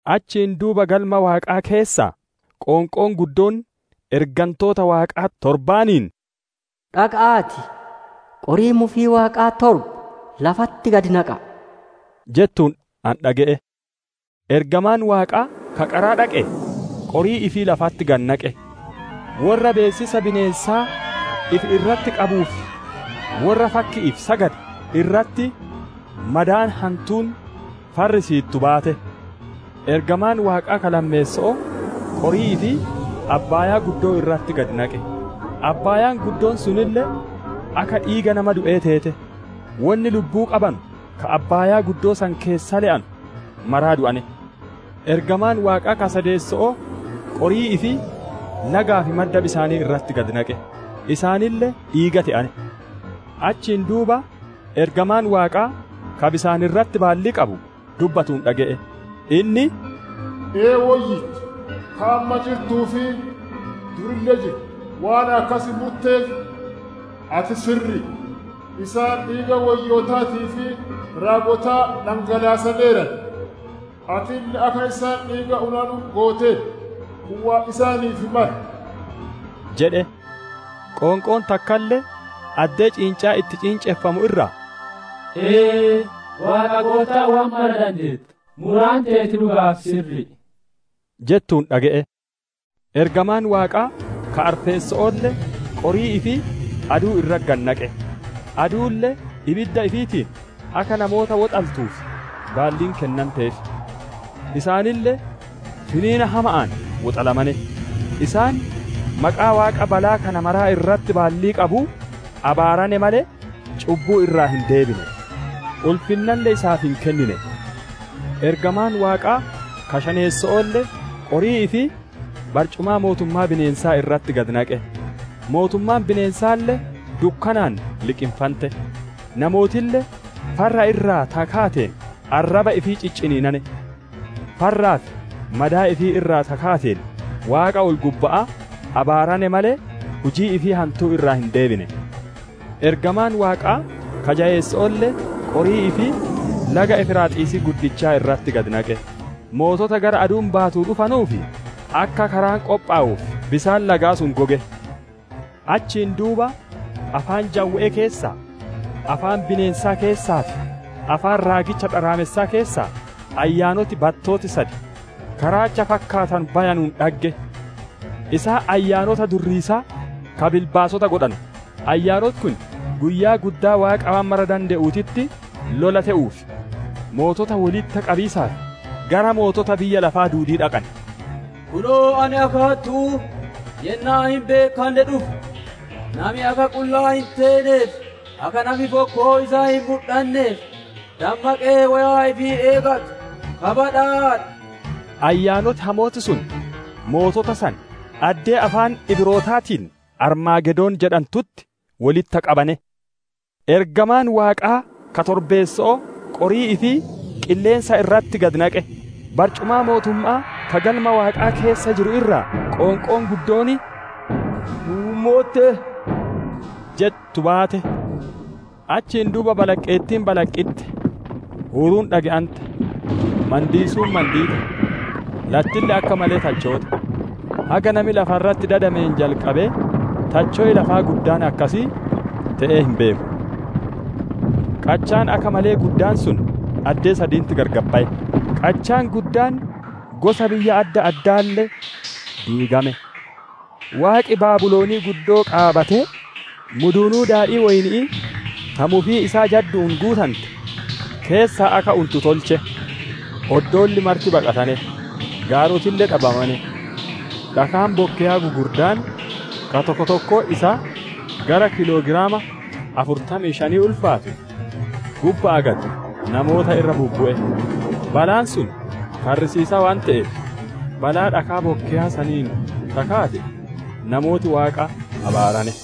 Achiin duuba Galma Waaqaa keessaa, qoonqoon guddoon ergantoota Waaqaa torbaaniin, «Dhaqa'aatii, qorii mufii Waaqaa torba lafatti gadi naqa'a!» jettuun ani dhage'e. Ergamaan Waaqaa ka qaraa dhaqee qorii ifii lafatti gadi naqe; worra beessisa bineensaa ifi irratti qabuu fi worra fakki'iif sagade irratti madaan hantuun farrisiittu baate. Ergamaan Waaqaa ka lammeesso'oo, qorii ifii abbaayaa irratti gadi naqe; abbaayaan guddoon sunille akka dhiiga nama du'ee teete; wonni lubbuu qabanu ka abbaayaa san keessa le'anu mara du'ane. Ergamaan Waaqaa ka sadeesso'oo qorii ifii lagaa fi madda bisaanii irratti gadi naqe; isaaniille dhiiga te'ane. Achiin duuba ergamaan Waaqaa ka bisaan irratti baallii qabu dubbatuun dhage'e; inni, «Ee, Woyyicha, ka amma jirtuu fi durille jirtu, waan akkas murteef, ati sirri'i; isaan dhiiga woyyootaatii fi raagotaa dhangalaasaneeran; atille akka isaan dhiiga unanu gooteerta; kun waan isaaniif male!» jedhe. Qoonqoon takkalle addee ciincaan itti ciinceffamu irraa, «Ee, Goottaa Waaqa waan mara dandeettu, muraan teeti dhuga'aa fi sirri'i» jettuun dhage'e. Ergamaan Waaqaa ka arfeesso'oolle, qorii ifii aduu irratti gadi naqe; aduulle ibidda ifiitiin akka namoota woxaltuuf baalliin kennanteef. Isaanille finiina hama'aan woxalamane; isaan maqaa Waaqa balaa kana mara irratti baallii qabuu abaarane malee, cubbuu irraa hin deebine, ulfinnalle isaaf hin kennine. Ergamaan Waaqaa ka shaneesso'oolle, qorii ifii barcumaa mootummaa bineensaa irratti gadi naqe; mootummaan bineensaalle dukkanaan liqinfante; namootille farra irraa ta kaateen arraba ifii cicciniinane. Farraa fi madaa ifii irraa ta kaateen Waaqa ol-gubba'aa abaarane malee, hujii ifii hantuu irraa hin deebine. Ergamaan Waaqaa ka jayeesso'oolle, qorii ifii laga Efraaxiisii guddicha irratti gad naqe; mootota gara aduun baatuu dhufanuuf, akka karaan qophowuuf bisaan lagaa sun goge. Achiin duuba afaan jawwe'ee keessaa, afaan bineensaa keessaa fi afaan raagicha dharaamessaa keessaa, ayyaanoti battooti sad ka raacha fakkaatanu bayanuun dhagge. Isaan ayyaanota durriisaa, ka bilbaasota godhanu; ayyaanoti kun Guyyaa guddaa Waaqa waan mara dande'uutitti lola te'uuf, mootota wolitti qabiisaaf gara mootota biyya lafaa duudii dhaqan. «Kunoo, ani akka hattu'uu yennaa hin beekkanne dhufa! Nami akka qullaa hin teenee fi akka nafi fokkoo isaa hin mudhanneef, dammaqee, woyaa ifii eeggatu ka badhaadhe!» Ayyaanoti hamooti sun mootota san addee afaan Ibrootaatiin, «Armaagedoon» jedhantutti wolitti qabane. Ergamaan Waaqaa ka torbeesso'oo qorii ifii qilleensa irratti gadi naqe; barcumaa mootumma'aa ka Galma Waaqaa keessa jiru irraa, qoonqoon guddoon, «Muummotte» jettu baate. Achiin duuba balaqqeettiin balaqqitte, huuruun dhage'ante, mandiisuun mandiite, lattille akka malee tachoote; haga nami lafa irratti dadameen jalqabee tacho'i lafaa guddaan akkasii te'ee hin beeku. Qachaan akka malee gudddaan sun addee saditti gargar baye; qachaan guddaan gosa biyya adda addaalle diigame. Waaqi Baabilon guddoo qaabatee, muduunuu daadhii woyni'ii ta mufii jaddu'uun guutante keessaa akka untu tolche. Oddoolli marti baqatane; gaarotille dhabamane. Dhakaan bokkeyaa gugurdaan, ka tokkoon tokkoon isaa gara kiiloogiraama afurtamii shanii ulfaatu, gubba'aa gad namoota irra bubbu'e; balaan sun farrisiisaa waan te'eef, balaa dhakaa bokkeyaa saniin ta kaate, namooti Waaqa abaarane.